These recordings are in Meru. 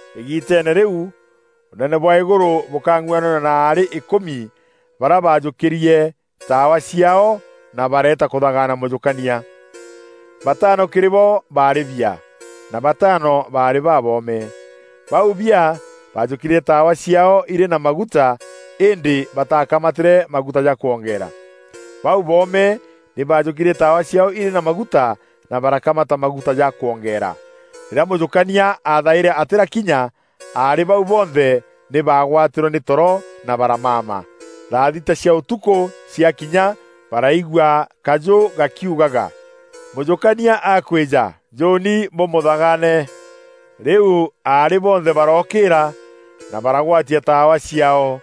“Îgiiteene rîu Ûnene bwa îgûrû bûkang'uananua na aarî îkûmi barîa baajûkîrie taawa ciaao na bareeta kûthagana mûjûkania. Bataano kîrî bo baarî biaa, na bataano baarî baboome. Bau biaa baajûkîrie taawa ciaao irî na maguta îndî bataakamatîre maguta ja kwongeera. Bau boome nî baajûkîrie taawa ciaao irî na maguta na barakamata maguta ja kwongeera. Rîrîa mûjûkania aathaîre atîrakinya, aarî bau bonthe nî baagwatîrwe nî toro, na baramama. Thathita cia ûtukû ciakinya baraigua kajû gakiugaga: ‘Mûjûkania akwîja! Njûûni bûmûthagaane.’ Rîu aarî bonthe barookîîra, na baragwatia taawa ciaao.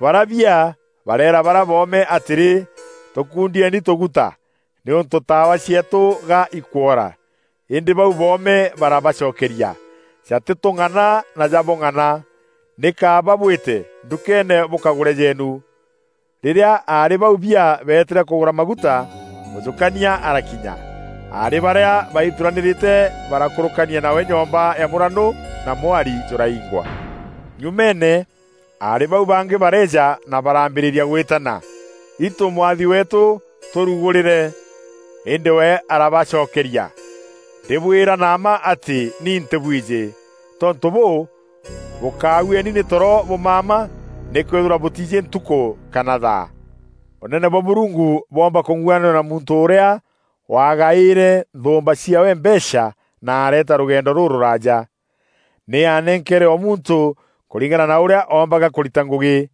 Barîa biaa bareera barîa boome atîrî, ‘Tûkûndieni tûgûta, nîûntû taawa cieetû ga ikwoora.’ Îndî bau boome barabacokeria: ‘Jatîtûng’ana na jabûng'ana! Nî kaaba bwîte ndûkeene bûkagûre jeenu. Rîrîa aarî bau biaa beetîre kûgûra maguta, mûjûkania arakinya. Aarî barîa baithuranîrîte barakûrûkania nawe nyomba ya mûranû na mwari jûraingwa. Nyumeene, aarî bau bangî bareeja na baraambîrîria gwîtana: ‘Itû mwathi weetû, tûrûgûrîre!’ Îndî we arabacokeria, ‘Ndîbwîra na mma atî, ni ntîbwijî.’ Tontû bûû, bûkaaueni nî toro bûmama nîkwîthîrwa bûtiijî ntukû kana thaa.” “Ûnene bwa Mûrungu bwoomba kûng'uananua na muntû ûrîa waagaîre nthûûmba ciaawe mbeecha na areeta rûgendo rûrûraaja. Nî aanenkeere o muntû kûringana na ûrîa oombaga kûrita ngûgî.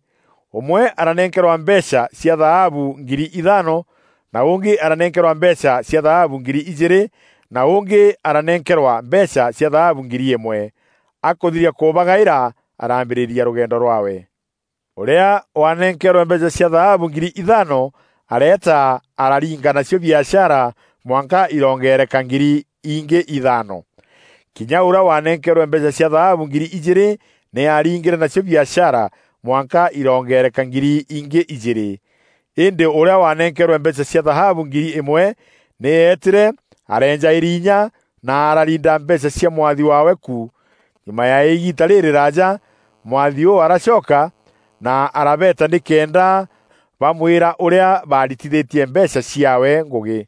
Ûmwe aranenkerwa mbeecha cia thaabu ngiri ithaano, na ûngî aranenkerwa mbeecha cia thaabu ngiri ijîîrî na ûngî aranenkerwa mbeecha cia thaabu ngiri îmwe. Akûthiria kûbagaîra, araambîrîria rûgendo rwaawe. Ûrîa waanenkeerwe mbeecha cia thaabu ngiri ithaano, areeta araringa nacio biashara mwanka iroongereka ngiri ingî ithaano. Kinya ûrîa waanenkeerwe mbeecha cia thaabu ngiri ijîîrî nî aaringîre nacio biashara mwanka iroongereka ngiri ingî ijîîrî. Îndî ûrîa waanenkeerwe mbeecha cia thaabu ngiri îmwe, nî eetîre areenja îrinya na arariinda mbeecha cia mwathi waawe ku. Nyuma ya îgiita rîrîraaja, mwathi ûu aracoka, na arabeeta nîkenda bamwîra ûrîa baritithîtie mbeecha ciaawe ngûgî.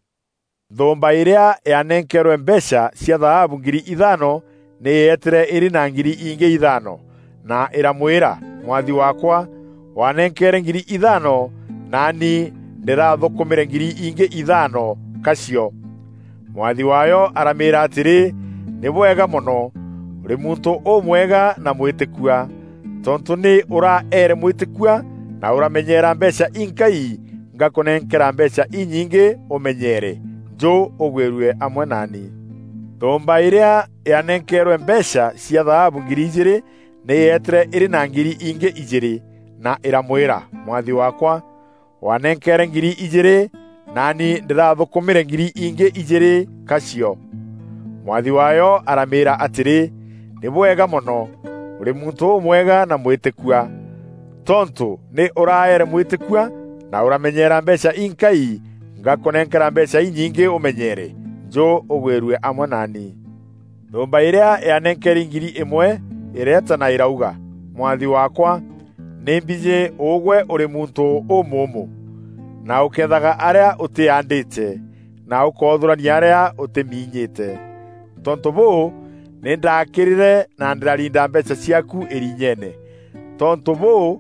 Nthûûmba îrîa yaanenkeerwe mbeecha cia thaabu ngiri ithaano nî yeetîre îrî na ngiri ingî ithaano, na îramwîra: ‘Mwathi waakwa, waanenkeere ngiri ithaano, na nî ndîrathûnkûmîre ngiri ingî ithaano, ka cio.’ Mwathi waayo aramîîra atîrî, ‘Nî bwega mono, ûrî muntû ûmwega na mwîtîkua. Tontû nî ûraeere mwîtîkua, na ûramenyeera mbeecha inkai, ngakûnenkera mbeecha inyingî ûmenyeere. Njû ûgwîrue amwe naani.’ Nthûûmba îrîa yaanenkeerwe mbeecha cia thaabu ngiri ijîîrî nî yeetîre îrî na ngiri ingî ijîîrî, na îramwîra: ‘Mwathi waakwa, waanenkeere ngiri ijîîrî, na nî ndîrathûnkûmîre ngiri ingî ijîîrî, ka cio.’ Mwathi waayo aramîîra atîrî, ‘Nî bwega mono, ûrî muntû ûmwega na mwîtîkua. Tontû nî ûraeere mwîtîkua, na ûramenyeera mbeecha inkai, ngakûnenkera mbeecha inyingî ûmenyeere. Njû ûgwîrue amwe naani.’ Nthûûmba îrîa yaanenkeri ngiri îmwe îreeta na îrauga, ‘Mwathi waakwa, nî mbijî ûgwe ûrî muntû ûmûûmû na ûkeethaga arîa ûtîaandîte, na ûkoothûrania arîa ûtîminyîîte. Tontû bûû, nî ndaakîrîre na ndîrariinda mbeecha ciaaku îriinyeene. Tontû bûû,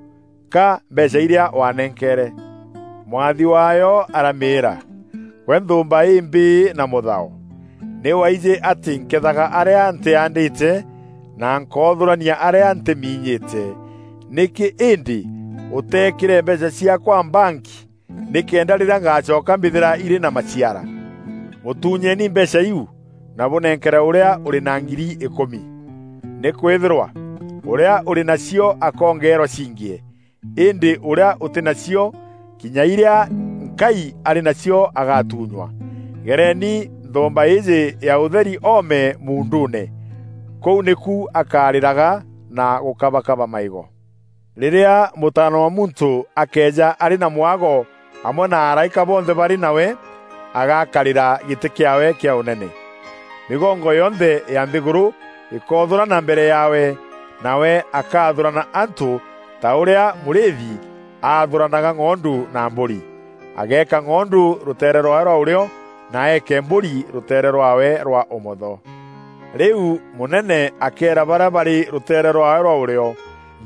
ka mbeecha irîa waanenkeere.’ Mwathi waayo aramîîra, ‘Gwe nthûûmba îmbîî na mûthao! Nî waijî atî nkeethaga arîa ntîaandîte, na nkoothûrania arîa ntîminyîte. Nîkî îndî ûteekîre mbeecha ciaakwa mbanki nîkenda rîrîa ngaacoka mbîthîra irî na maciara?’ Mûtuunyeeni mbeecha iu, na bûnenkere ûrîa ûrî na ngiri îkûmi. Nîkwîthîrwa ûrîa ûrî na cio akoongeerwa ciingîe. Îndî ûrîa ûtî na cio, kinya irîa nkai arî na cio agaatunywa. Gereeni nthûûmba îîjî ya ûtheri oome muunduune! Kûu nîku akarîraga na gûkabakaba maîgo. “Rîrîa Mûtaana wa Muntû akeeja arî na mwago amwe na araîka bonthe barî nawe, agakarîra gîtî kîaawe kîa ûnene. Mîgongo yonthe ya nthîgûrû îkoothûrana mbere yaawe, nawe akaathûrana antû ta ûrîa mûrîîthi aathûranaga ng'ondu na mbûri. Ageeka ng'ondu rûteere rwaawe rwa ûrîo, na eeke mbûri rûteere rwaawe rwa ûmotho. Rîu mûnene akeera barîa barî rûteere rwaawe rwa ûrîo,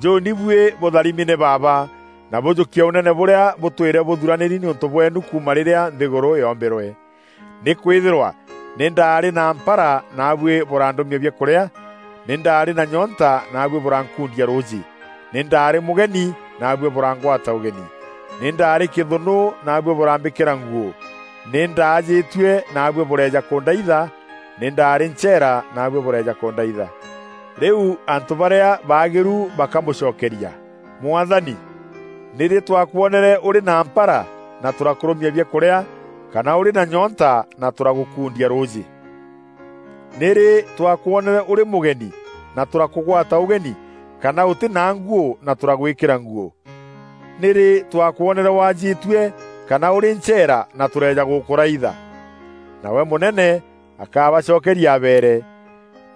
‘Njûûni buî bûtharimi nî Baaba na bûjûkie Ûnene bûrîa bûtwîre bûthûranîri nîûntû bweenu kuuma rîrîa nthîgûrû yoombîrwe. Nîkwîthîrwa nî ndaarî na mpara naabuî bûrandûmia biakûrîa; nî ndaarî na nyoonta naabuî bûrankundia rûûjî; nî ndaarî mûgeni naabuî bûrangwata ûgeni; Nî ndaarî kîthûnû naabuî bûrambîkîra nguû; nî ndaajîtue naabuî bûreeja kûndaitha; nî ndaarî ncheera naabuî bûreeja kûndaitha.’ Rîu antû barîa baagîru bakamûcokeria, ‘Mwathani, nîrî twakwonere ûrî na mpara na tûrakûrûmia biakûrîa kana ûrî na nyoonta na tûragûkundia rûûjî? Nîrî twakwonere ûrî mûgeni na tûrakûgwata ûgeni kana ûtî na nguû na tûragwîkîra nguû? Nîrî twakwonere waajîtue kana ûrî ncheera na tûreeja gûkûraitha?’ Nawe mûnene akabacokeria abeere,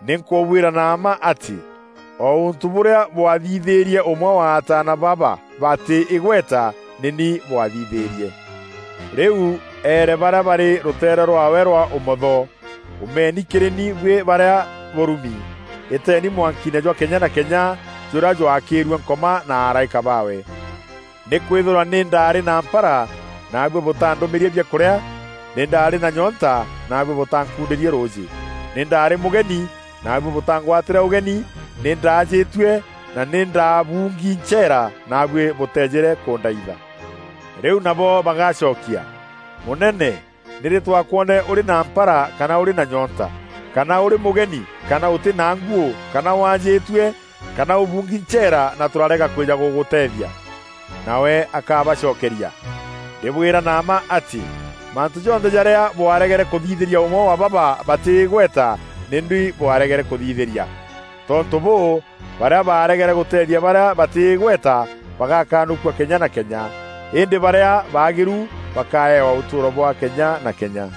‘Nî nkûbwîra na mma atî o ûntû bûrîa bwathithîîrie ûmwe wa ataana baba batî îgweta, nî ni bwathithîîrie.’ “Rîu eere barîa barî rûteere rwaawe rwa ûmotho, ‘Umeeni kîrî ni buî barîa bûrumi! Îteeni mwankiine jwa kenya na kenya jûrîa jwakîîrue Nkoma na araîka baawe. Nîkwîthîrwa nî ndaarî na mpara naabuî bûtaandûmîrie biakûrîa; nî ndaarî na nyoonta naabuî bûtaankundîrie rûûjî; Nî ndaarî mûgeni naabuî bûtaangwatîre ûgeni; nî ndaajîtue na nî ndaabuungi ncheera, naabuî bûteejîre kûndaitha.’ Rîu nabo bagacokia, ‘Mûnene, nîrî twakwonere ûrî na mpara kana ûrî na nyoonta kana ûrî mûgeni kana ûtî na nguû kana waajîtue kana ûbuungi ncheera, na tûrarega kwîja gûgûteethia?’ Nawe akabacokeria, ‘Ndîbwîra na mma atî, mantû jonthe jarîa bwaregere kûthithîria ûmwe wa baba batî îgweta, nî ni bwaregere kûthithîria.’ Tontû bûû, barîa baaregere gûteethia barîa batî îgweta, bagakanûkua kenya na kenya. Îndî barîa baagîru bakaewa ûtûûro bwa kenya na kenya.”